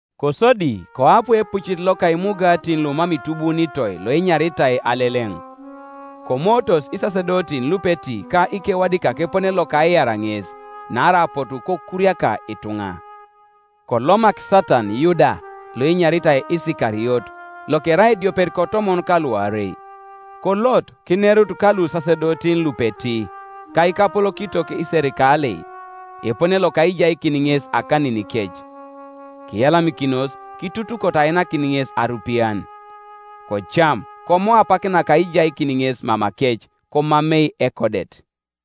Kosodi koapu epucit loka Imugatin lumam itubuunitoi loenyaritai Aleleŋ. Komootos isasedotin lupeti ka ikewadikak epone loka aiar ŋes; naarai apotu kokuriaka ituŋa. Kolomak Satan Yuda loenyaritai Isikariot, lokerai ediopet kotomon ka luarei; kolot kinerut ka lusasedotin lupeti, ka ikapolokitok iserikalei, epone loka aijaikin ŋes akaninikec. Kiyalamikinos, kitutukoto ainakin ŋes arupian. Kocam, komo apak naka aijaikin ŋes mamakec, komamei ekodet.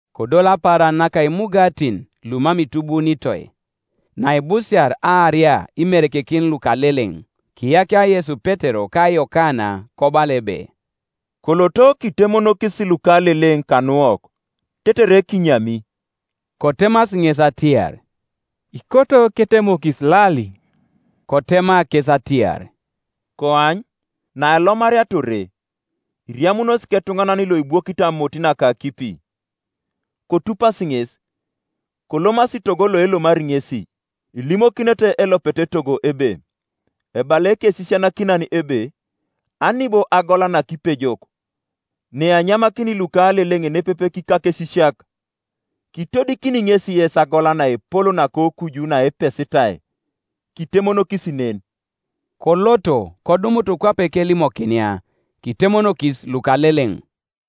Kodol apaaran naka Imugatin lumam itubuunitoi, naibusiar aaria imerekekin lukaleleŋ. Kiyakia Yesu Petero ka Yokana kobala ebe, “Koloto kitemonokis lukaleleŋ kanuwok, tetere kinyami.” Kotemasi ŋes atiar, “Ikoto ketemokis lali?” Kotema kes atiar, “Koany, nailomariata ore, iriamunos ketuŋanan loibwokit amot naka akipi; kotupasi ŋes, kolomasi togo loelomari ŋesi, Ilimokinete elopet etogo ebe, ‘Ebala Ekesisianakinan ebe, Ani bo agola nakipejok, neanyamakini lukaleleŋ nepepe kikakesisiak?’ Kitodikini ŋesi yes agola naepol nakokuju naepesitai; kitemonokis nen.” Koloto, kodumutu kwape kelimokinia; kitemonokis lukaleleŋ.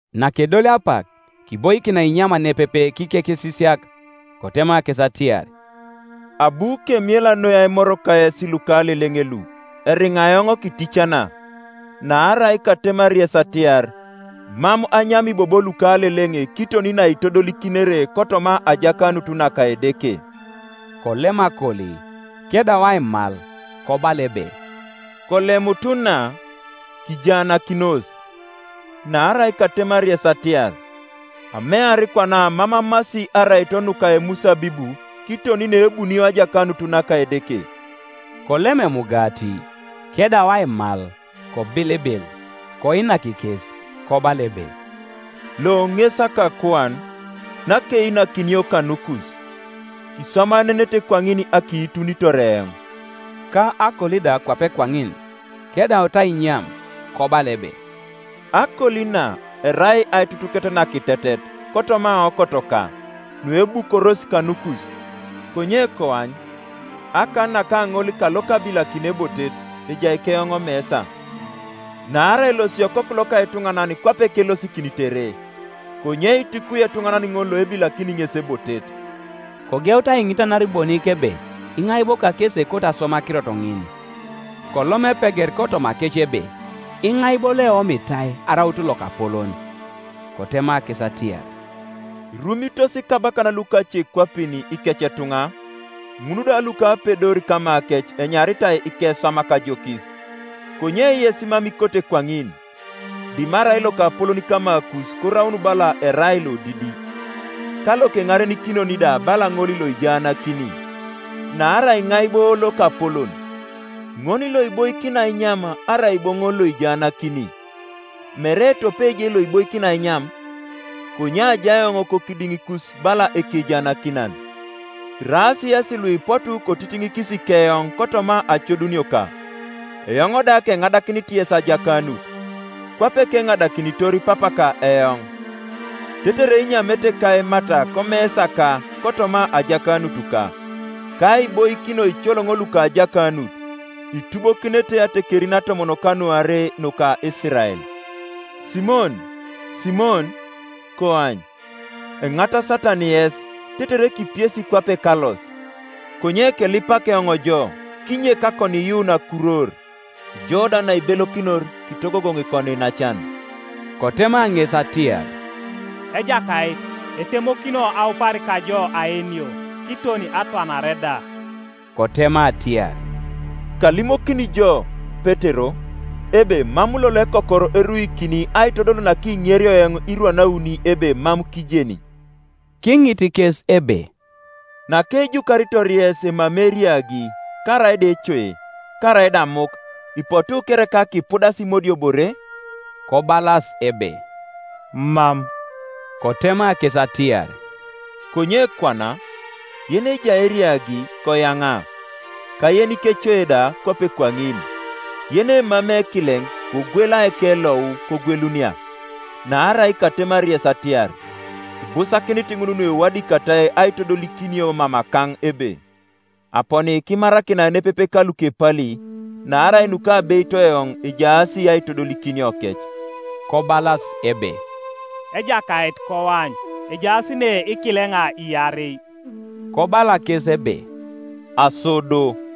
Nakedolio apak, kiboikin ainyam nepepe kikekesisiak. Kotema kes atiar, “Abu kemiela noi aimor kayes lukaleleŋ lu, eriŋa eoŋ kiticana; naarai katemari yes atiar, Mam anyami bobo lukaleleŋ kiton naitodolikinere kotoma ajakanut naka Edeke.” Kolem akoli, kedau aimal kobala ebe, “Kolemutu na, kijaanakinos: naarai katemari yes atiar, Amear kwana mam amasi araito nuka emusabibu kiton neebunio ajakanut naka Edeke.” Kolem emugati, kedau aimal, kobilibil, koinak kes, kobala ebe, “Lo ŋes akakuan, nakeinakinio kanukus: kiswamaenenete kwaŋin akiitunitor eoŋ,” Ka akoli da kwape kwaŋin kedautu ainyam, kobala ebe, “Akoli na erai aitutuket nakitetet kotoma aokotoka, nuebukoros kanukus. Konye koany, akan naka ŋol kalokabilakini ebotet ejai keoŋ omesa. Naarai elosi Okoku loka etuŋanan kwape kelosikinitere; konye itukwi etuŋanan ŋol loebilakini ŋes ebotet!” Kogeutu aiŋitanar bonik ebe Iŋai bo kakesi ekoto aswam akirot ŋin. Kolom epeget kotomakec ebe, Iŋai bo loeomitai araut lokapolon. Kotema kes atiar, “Irumitos ikabakan lukacekwapin ikecetuŋa; ŋul da lukapedor kamakec enyaritai ikeswamak ajokis. Konye yes mam ikote kwaŋin, dimarai lokapolon kamakus koraun bala erai lodidi, ka lokeŋarenikinon da bala ŋol loijaanakini. Naarai iŋai bo lokapolon, ŋol loiboikini ainyam, arai bo ŋol lojaanakini? Mere tope je loiboikini ainyam? Konye ajai eoŋ kokidiŋikus bala ekejaanakinan. “Iraas yesi luipotu kotitiŋikis keoŋ kotoma acodunioka; eoŋ da keŋadakinit yes ajakanut, kwape keŋadakinitor Papaka eoŋ, tetere inyamete ka aimat komesaka kotoma ajakanutuka, ka aiboikin oicoloŋo luka ajakanut, itubokinete atekerin atomon kanuarei nuka Isirael. “Simon, Simon, koany, enit Satan yes, tetere kipiesi kwape kalos, Konye kelipak eoŋ jo kinyek akoniiyuun akurwor; ijo da naibelokinor, kitogogoŋ ikoniinacan.” Kotema ŋes atiar, “Ejakait, etemokino aupar kajo aenio, kiton atwanare da.” Kotema atiar, “Kalimokini jo, Petero, ebe mam lolo ekokor eruikini aitodol nakiŋerio eoŋ irwan auni ebe mam kijeni.” Kiŋit kes ebe, “Nakejukaritor yes emamei eriagi, karaida ecoe, karaida amuk, ipotu kereka kipudas imodiobore?” Kobalas ebe, “Mam,” Kotema kes atiar, “Konye kwana, yenejai eriagi koyaŋa, ka yenikecoe da kwape kwaŋin. Yenemamei ekileŋ kogwela ekelou, kogwelunia. Naarai katemari yes atiar, Ibusakinit ŋun nuewadikatai aitodolikinio mamakaŋ ebe, ‘Aponi kimarakinai nepepe ka lukepali’; naarai nukabeito eoŋ ejaas aitodolikiniokec.” Kobalas ebe, “Ejakait, koany, ejaas ne ikileŋa iarei.” Kobala kes ebe, “Aso do.”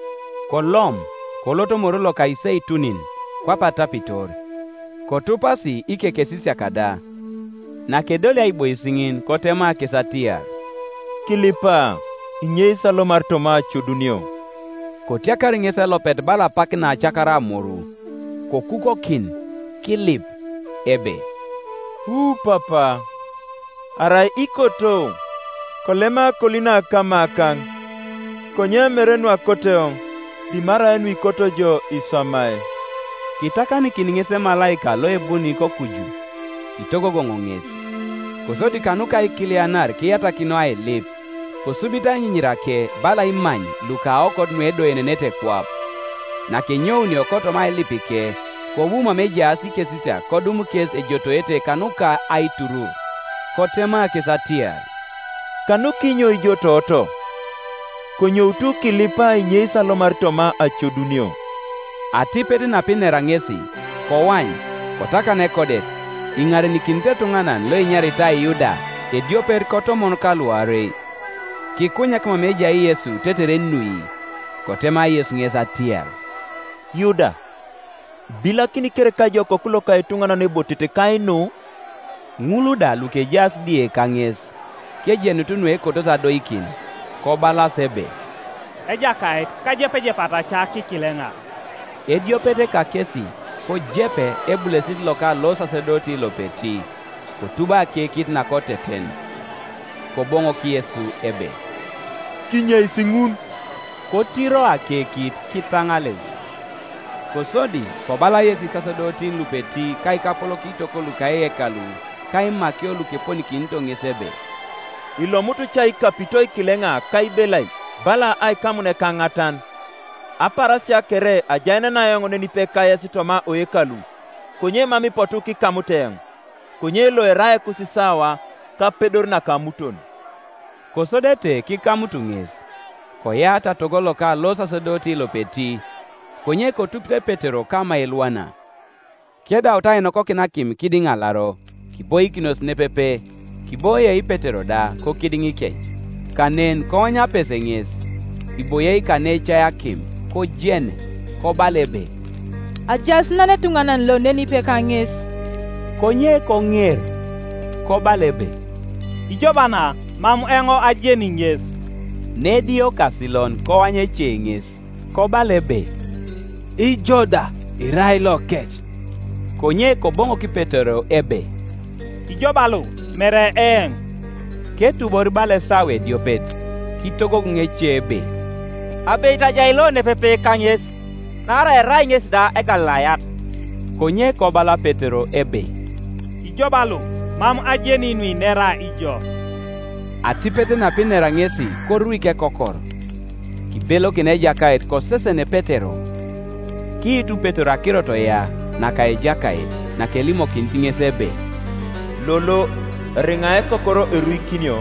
Kolom, kolot Moru loka Iseitunin, kwape atapitor; kotupasi ikekesisiak da. Nakedolio aibois ŋin kotema kes atiar, “Kilipa, kinyeis alomar toma acodunio.” Kotiakar ŋesi elopet bala apak naetiakara amoru, kokukokin, kilip, ebe, “Wu Papa, arai ikoto, kolema akoli na kamakaŋ; konye mere nuakoto eoŋ, dimarai nuikoto ijo kiswamai.” Kitakanikin ŋes emalaika loabuni kokuju, kitogogoŋ ŋes. Kosodi kanuka aikilianar kiyatak noi ailip; kosubito ainyinyirake bala imany luka aokot nuedoenenete kwap, Nakenyounio kotoma ailipike, kobu mama ejaas ikesisiak kodum kes ejotoete kanuka aiturur. Kotema kes atiar, “Kanukinyo ijotooto? Konyoutu kilipa kinyeis alomar toma acodunio.” Atipet napinera ŋesi, koany, kotakan ekodet, iŋarenikinit etuŋanan loenyaritai Yuda, ediopet kotomon ka luarei. Kikunyak mama ejai Yesu tetere enui. Kotema Yesu ŋes atiar, “Yuda, ibilakini kereka ijo Okoku loka etuŋanan ebotet kainu?” Ŋul da lukejaas die kaŋes, kojenutu nuekotosi adoikin, kobalas ebe, “Ejakait, kajepejepata ca kikileŋa?” Ediopet kakesi kojepe ebulesit loka losasedoti lopeti kotubo akekit nakoteten, Koboŋok Yesu ebe, “Kinyeis ŋun!” Kotiro akekit kitaŋaleu. Kosodi kobala Yesu isasedotin lupeti ka ikapolokitok luka eyekalu ka imakio lukeponikinito ŋes ebe, “Ilomutu ca ikapito ikileŋa ka ibelai bala aikamun ekaŋatan? Apaarasia kere ajaenena eoŋ nenipe kayes toma oyekalu, konye mam ipotu kikamut eoŋ. Konye lo erai ekusisawa, ka apedor naka amuton.” Kosodete kikamut ŋes, koyaata togo loka losasedoti lopeti, konye kotupite Petero kama elwana. Kedaut ainokokin akim kidiŋ alaro, kiboikinos nepepe, kiboie Petero da kokidiŋikec, Kanen koany apese ŋes, iboie kaneejai akim, kojene, kobala ebe, “Ajaas nan etuŋanan lo nenipe kaŋes.” Konye koŋer, kobala ebe, “Ŋo ba na, mam eoŋ ajeni ŋes,” Nediokasilon koany ece ŋes, kobala ebe, “Ijo da irai lokec.” Konye Koboŋok Petero ebe, “Ijo ba lo, mere eoŋ,” Ketubor bala esawa ediopet kitogogoŋ ece ebe, “Abeit ajai lo nepepe kaŋes; naarai erai ŋesi da Egalilayat.” Konye kobala Petero ebe, “Ijo ba lo, mam ajeni nuinera ijo.” Atipet napinera ŋesi koruik ekokor. Kibelokin Ejakait kosesen Petero. Kiitu Petero akirot ya naka Ejakait, nakelimokinit ŋes ebe, “Lolo, eriŋa ekokor eruikino,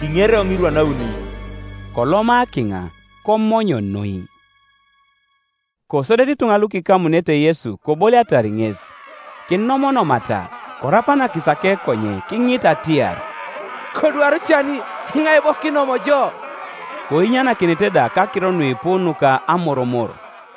kiŋeri eoŋ irwan auni.” Koloma kiŋa komony noi. Kosodete ituŋa lukikamunete Yesu koboliatar ŋes, kinomonomata; korapanakis akekonye kiŋita atiar, “Kodwaru cani! Iŋai bo kinom jo?” Koinyanakinete da kakiro nuipu nuka amoromor.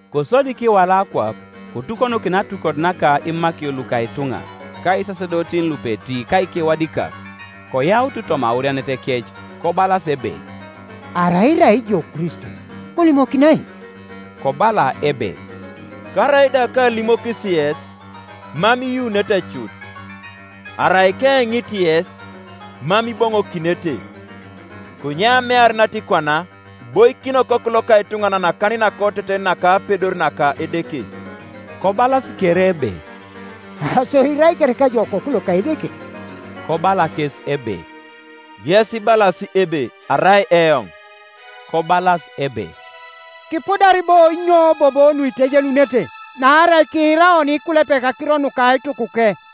Kosodi kiwala akwap, kotukonokin atukot naka imakio luka ituŋa, ka isasedotin lupeti ka ikewadikak; koyautu toma aurianetekec, kobalas ebe, “Arai irai ijo Kristo, kolimokinai.” Kobala ebe, “Karaida kaalimokis yes, mam iyuunete cut; Arai keeŋit yes, mam iboŋokinete. Konye amear natikwana iboikin Okoku loka etuŋanan akan nakoteten naka apedor naka Edeke.” Kobalas kere ebe, “Aso irai kereka ijo Okoku loka Edeke?” Kobala kes ebe, “Yes ibalas ebe arai eoŋ.” Kobalas ebe, “Kipudar bo inyo bobo nuitejenunete? Naarai kiira oni ikulepek akiro nuka aitukuke.”